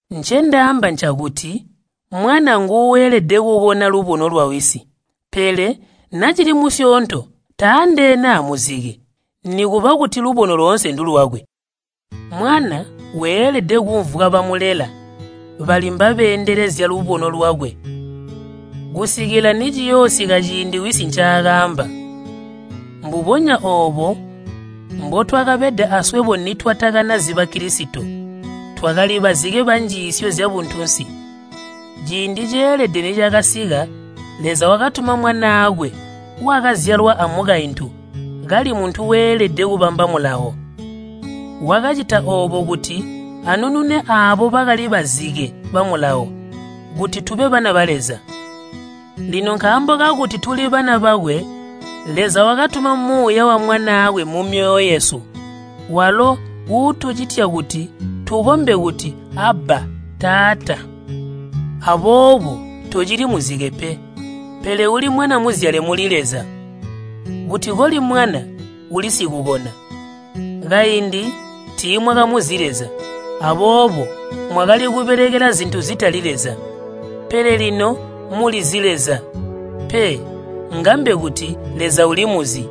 Ncendaamba ncakuti mwana nguuelede kukona lubono lwawisi. Pele nacili musyoonto taandeene amuzike, nikuba kuti lubono loonse ndulwakwe. Mwana weelede kumvwa bamulela bali mbabeendelezya lubono lwakwe kusikila niciyoosika ciindi wisi ncaakaamba. Mbubonya oobo mbotwakabede aswebo nitwatakanaziba Kilisito, twakali bazike banjiisyo zyabuntunsi. Ciindi ceelede nicakasika, Leza wakatuma Mwanaakwe wakazyalwa amukaintu kali muntu weelede kubamba Mulawo. Wakacita oobo kuti anunune aabo bakali bazike ba Mulawo, kuti tube bana ba Leza. Lino nkaambo kakuti tuli bana bakwe, Leza wakatuma Muuya wa Mwanaakwe mumyoyo yesu, walo uutucitya kuti tukombe kuti, “Abba! Taata!” Aboobo tocili muzike pe, pele uli mwana muzyale muli Leza. Kuti koli mwana uli sikukona. Kaindi tiimwakamuzi Leza, aboobo mwakali kubelekela zintu zitali Leza. Pele lino mulizi Leza, pe, ngambe kuti Leza ulimuzi,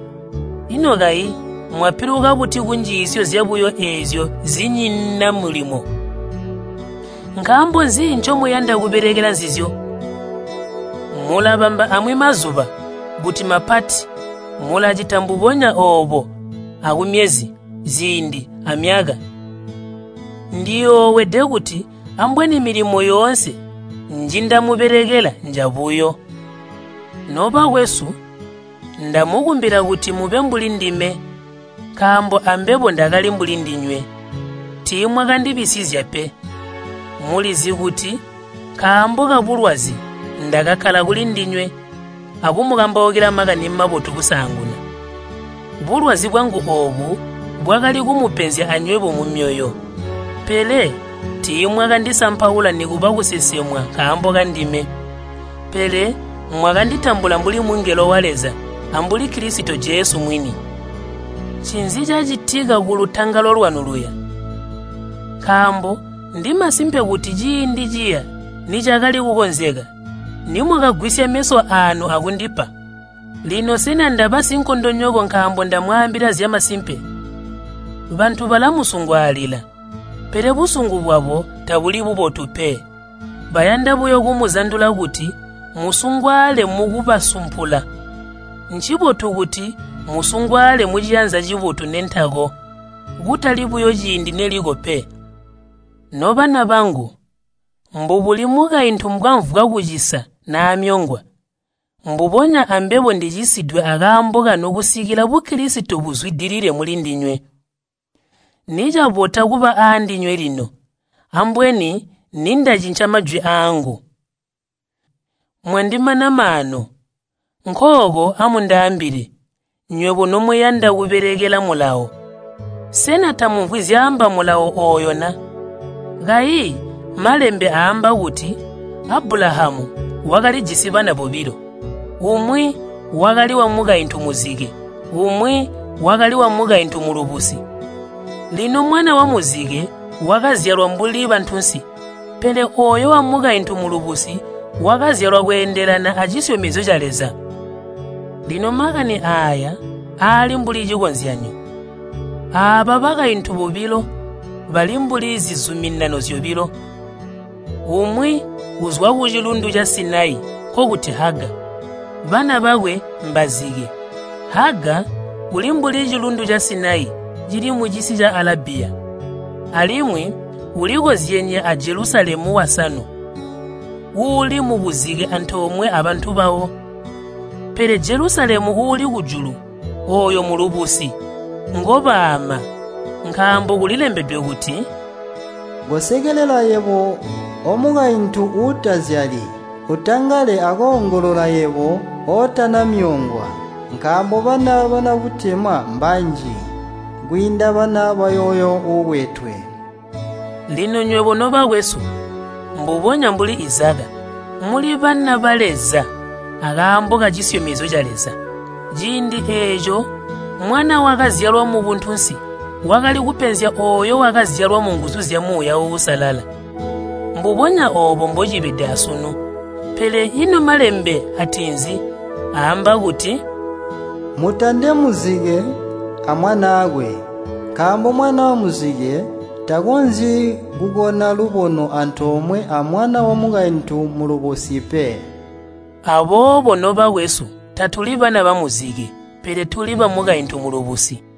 ino kayi mwapiluka buti kunjiisyo zyabuyo eezyo zinyina mulimo? Nkaambo nzi ncomuyanda kubelekela nzizyo? Mulabamba amwi mazuba kuti mapati mulacita mbubonya oobo aku myezi, ziindi, amyaka. Ndiyoowede kuti ambweni milimo yoonse njindamubelekela njabuyo. Nobakwesu, ndamukumbila kuti mube mbuli ndime nkaambo ambebo ndakali mbuli ndinywe. Tiimwakandibisizya pe. Mulizi kuti nkaambo kabulwazi ndakakkala kulindinywe akumukambaukila Makani Mabotu kusaanguna. Bulwazi bwangu oobu bwakali kumupenzya anywebo mumyoyo, pele tiimwakandisampaula nikuba kusesemwa nkaambo kandime, pele mwakanditambula mbuli mungelo wa Leza ambuli Kilisito Jesu mwini. Ncinzi cacitika kulutangalo lwanu luya? Nkaambo ndimasimpe kuti ciindi ciya nicakali kukonzeka, nimwakagwisya meso aanu akundipa. Lino sena ndaba sinkondonyoko nkaambo ndamwaambila zyamasimpe? Bantu balamusungwaalila, pele busungu bwabo tabuli bubotu pe. Bayanda buyo kumuzandula kuti musungwaale mukubasumpula. Ncibotu kuti musungwaale muciyanza cibotu nentako, kutali buyo ciindi neliko pe. Nobana bangu, mbubuli mukaintu mbwamvwa kucisa naamyongwa, mbubonya ambebo ndicisidwe akaambo kanu kusikila Bukilisito buzwidilile mulindinywe. Nicabota kuba aandinywe lino, ambweni nindacinca majwi aangu. Mwandimana maanu. Nkooko amundaambile, nywebo nomuyanda kubelekela Mulawo, sena tamumvwi zyaamba Mulawo ooyo na? Kayi Malembe aamba kuti Abulahamu wakalijisi bana bobilo. Umwi wakali wamukaintu muzike, umwi wakali wamukaintu mulubusi. Lino mwana wamuzike wakazyalwa mbuli bantunsi, pele ooyo wamukaintu mulubusi wakazyalwa kweendelana acisyomezyo ca Leza. Lino makani aaya aali mbuli cikozyanyo, aaba bakaintu bobilo bali mbuli zizuminano zyobilo. Umwi uzwa ku cilundu ca Sinai nkokuti Haga, bana bakwe mbazike. Haga uli mbuli cilundu ca Sinai cili mucisi ca Alabiya, alimwi ulikozyenye a Jelusalemu wasunu, uuli mubuzike antoomwe abantu bawo. Pele Jelusalemu uuli kujulu ooyo mulubusi, ngobaama. Nkaambo kulilembedwe kuti, “Kosekelela yebo omukaintu uutazyali. Utangale akoongolola yebo ootanamyongwa. Nkaambo bana banabutema mbanji, kwiinda bana bayooyo uukwetwe.” Lino nywebo nobakwesu, mbubonya mbuli Izaka, muli bana ba Leza akaambo kacisyomezyo ca Leza. Ciindi eeco mwana wakazyalwa mubuntunsi wakali kupenzya ooyo wakazyalwa munguzu zya Muuya Uusalala. Mbubonya oobo mbocibede asunu. Pele ino Malembe ati nzi? Aamba kuti, “Mutande muzike amwanaakwe, nkaambo mwana wamuzike takonzyi kukona lubono antoomwe amwana wamukaintu mulubusi pe.” Aboobo nobakwesu, tatuli bana bamuzike, pele tuli bamukaintu mulubusi.